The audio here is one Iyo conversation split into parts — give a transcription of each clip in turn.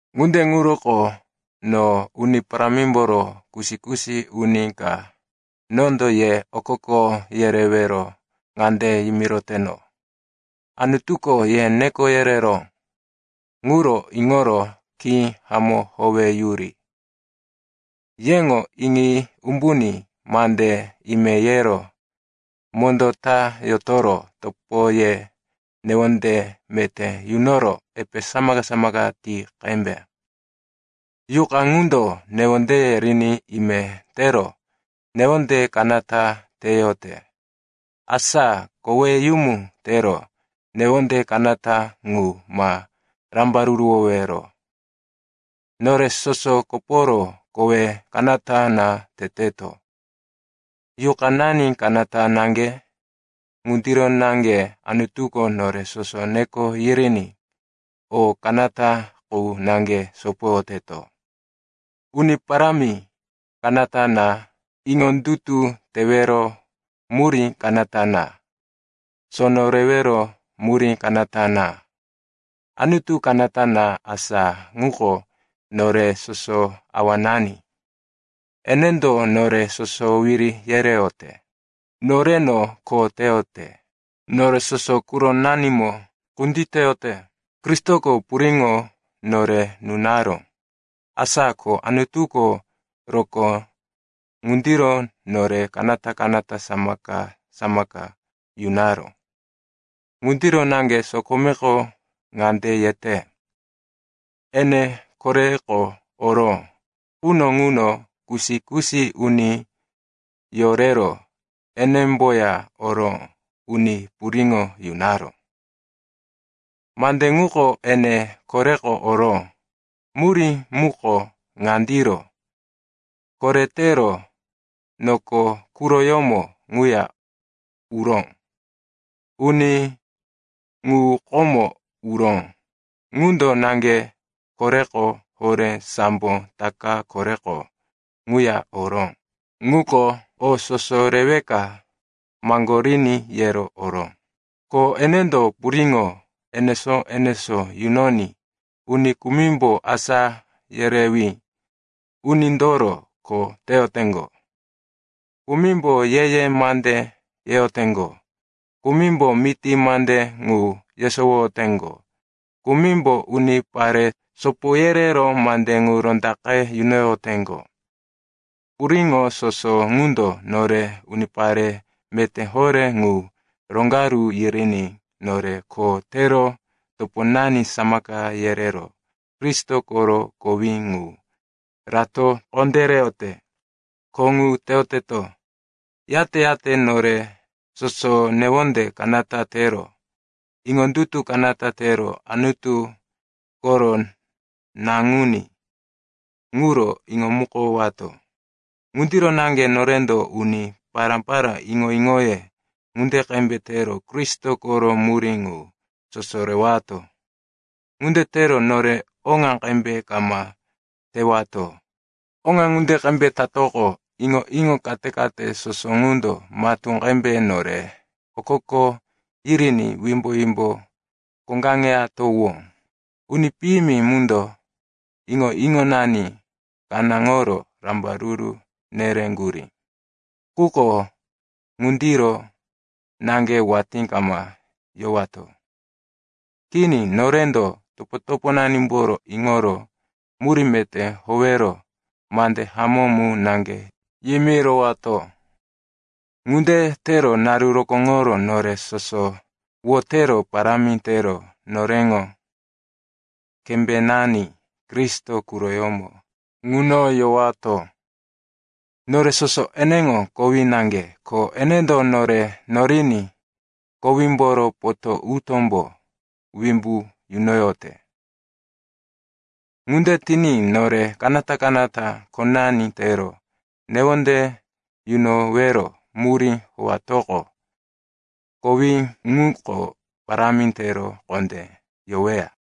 Ŋunde ŋuroko no, Uni Parámimboro kusi-kusi uni ka, nondo ye okoko yerewero ŋande yimiroteno, Anutuko ye neko yereró ŋuro iŋoro khí hamó howeyuri. Yeŋo iŋi umbuní mande ime yero mondó ta yotoro topoye newonde meté yunoro epe samaka-samaka ti qembe. Yuqa ŋundo newondeye riní ime tero newonde kanata teyote. Asa koweyumu tero newonde kanata ŋu ma rambaruruwowero. Nore soso koporo kowe kanata na teteto, yuqanani kanata naŋge. Ŋundiro naŋge Anutuko nore soso neko yiriní o kanata qu naŋge sopoyoteto. Uni Parámi kanata na, iŋondutu tewero murí kanata na, sono rewero murí kanata na. Anutu kanata na, asa ŋuko nore soso awanani. Enendo nore soso wiri yereyote, noreno kho teyote, nore soso quronanimo kunditeyote. Kristoko puriŋo nore nunaró, asa ko Anutuko rokó ŋundiro nore kanata-kanata samaka-samaka yunaró. Ŋundiro naŋge sokomeko ŋande yete, “Ene koreko oró quno ŋuno kusi-kusi uni yorero enemboya oro uni puriŋo yunaró.” Mande ŋuko, “ene koreko oró,” murí muko ŋandiro, koretero noko quroyómo ŋuya uró. Uni ŋu komo uró, ŋundo naŋge koreko horé sambo taka koreko ŋuya oró, ŋuko o soso reweka maŋgoriní yero oró. Ko enendo puriŋo enesó-enesó yunoní uni kumimbo asá yerewí unindoro kho teyoteŋgo, kumimbo ye-ye mande yeyoteŋgo, kumimbo miti mande ŋu yesowoyoteŋgo, kumimbo unipare sopo yerero mande ŋu rondaqe yunoyoteŋgo. Puriŋo soso ŋundo nore unipare meté horé ŋu roŋgaru yiriní nore kho tero toponani samaka yerero Kristo koro kowí ŋu rato kondéreyote. Kho ŋu teyoteto, yate-yate nore soso newonde kanata tero iŋondutu kanata tero Anutu koro Naŋuní ŋuro iŋomukowato. Ŋundiro naŋge norendo uni pará-pará iŋo-iŋoye ŋunde qembe tero Kristo koro murí ŋu soso rewato. Ŋunde tero nore oŋa qembe kama tewato. Oŋa ŋunde qembe tatoqo, iŋo-iŋo kate-kate soso ŋundo matú qembe nore okoko yiriní wimbo-wimbo koŋgaŋeyatowó. Uni piyimi mundo iŋo-iŋonani kanáŋoro rambaruru nereŋgurí. Quko ŋundiro naŋge watí kama yowato. Kini, norendo toponanimboro iŋoro murí meté howero mande hamó mu naŋge yimirowato. Ŋunde tero naru rokóŋoro nore soso wotero parámi tero noreŋo kembénani Kristo quroyómo ŋuno yowato. Nore soso eneŋo kowí naŋge, ko enendo nore noriní kowímboro potó-utómbo wimbu nunoyote. Ŋunde tiní nore kanata-kanata khonani tero newonde yunowero murí howatoqo, kowí ŋuko parámi tero kondé yoweya.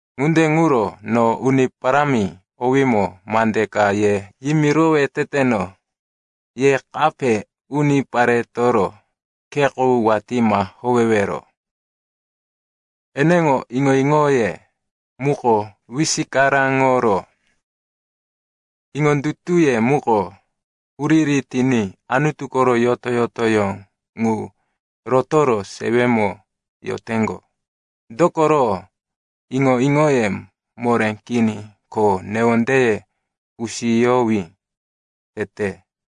Ŋunde ŋuro no Uni Parámi owímo mande ka ye yimirowe teteno. Ye kape uniparetoro khe qu watí ma howewero. Eneŋo iŋo-iŋoye muko wisikaraŋoro iŋondutuye muko huriri tiní Anutu koro yoto-yotoyó ŋu rotoro sewemo yoteŋgo. Dokoro iŋo-iŋoye moré kini ko newondeye kusiyowí tete.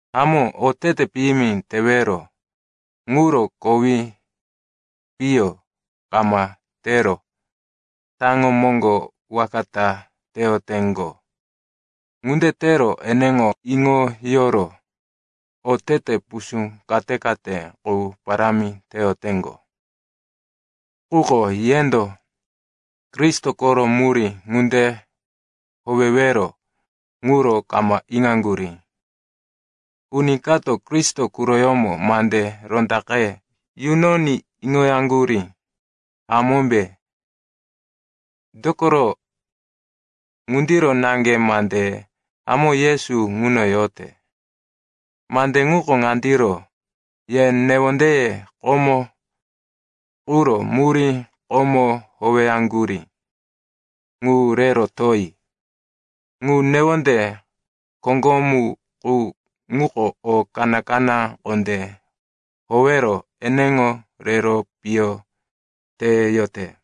Hamó, otete piyimi tewero ŋuro kowi piyo kama tero taŋo moŋgo waka ta teyoteŋgo. Ŋunde tero eneŋo iŋoyoro otete pusú kate-kate qu parámi teyoteŋgo. Quko yendo Kristo koro murí ŋunde howewero ŋuro kama iŋaŋgurí. Uni kato Kristo quroyómo mande rondaqe yunoní iŋoyaŋgurí, hamómbe? Dokoro ŋundiro naŋge mande hamó Yesu ŋuno yote. Mande ŋuko ŋandiro: ye newondeye komo quro murí komo howeyaŋgurí ŋu re rotoyi. Ŋu newonde koŋgomu qu ŋuko o kaná-kaná kondé howero eneŋo rero piyo teyote.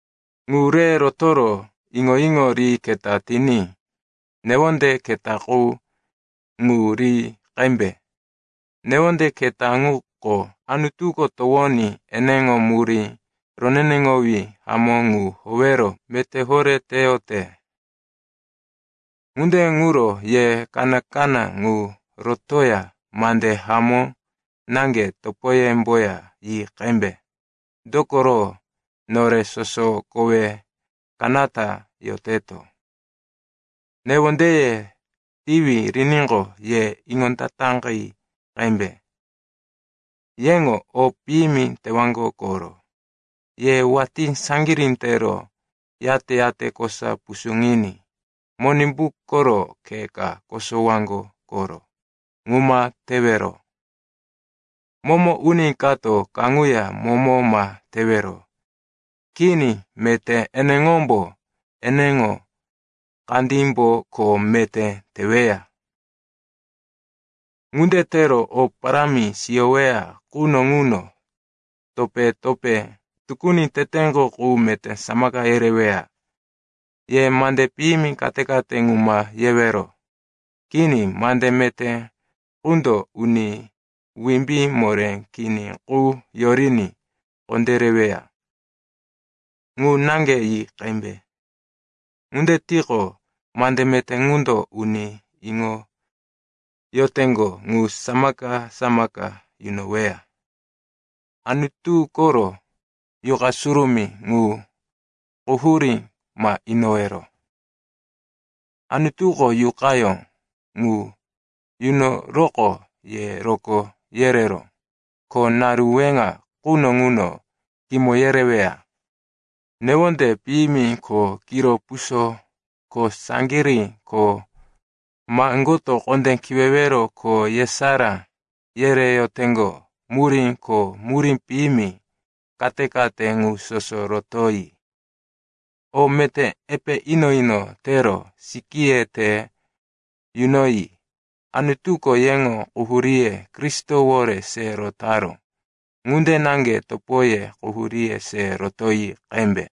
Ŋu re rotoro iŋo-iŋo ri keta tiní newonde keta qu ŋu ri qembe. Newonde keta ŋuko Anutuko towoní eneŋo murí roneneŋowí hamó ŋu howero meté horé teyote. Ŋunde ŋuro ye kaná-kaná ŋu rotoya mande hamó naŋge topoyemboya yi qembe. Dokoro nore soso kowe kanata yoteto. Newondeye tiwi riníqo, ye iŋondataqi qembe. Yeŋo o piyimi tewaŋgo koro. Ye watí saŋgirí tero, yate-yate kosa pusuŋiní Monimbu koro khe ka kosowaŋgo koro. Ŋu ma tewero. Momo uni kato kaŋuya momo ma tewero. Kini. Meté eneŋombo eneŋo kandímbo kho meté teweya. Ŋunde tero o parámi siyoweya quno ŋuno topé-topé tukuni teteŋgo qu meté samaka yereweya. Ye mande piyimi kate-kate ŋu ma yewero. Kini, mande meté qundo uni wimbí moré kini qu yoriní kondéreweya ŋu naŋge yi qembe. Ŋunde tiqo, mande meté ŋundo uni iŋoyoteŋgo ŋu samaka-samaka yunoweya. Anutu koro Yuqa Surumí ŋu quhurí ma inowero. Anutuko Yuqayó ŋu yunoroqo ye rokó yereró, ko naru weŋa quno ŋuno kimo yereweya. Newonde piyimi ko kiro puso ko saŋgirí ko maŋgoto kondé kiwewero ko yesará yereyoteŋgo murí ko murí piyimi kate-kate ŋu soso rotoyi. O meté epe ino-ino tero sikíye te yunoyi. Anutuko yeŋo quhuríye Kristowore se rotaró ŋunde naŋge topoye quhuríye se rotoyi qembe.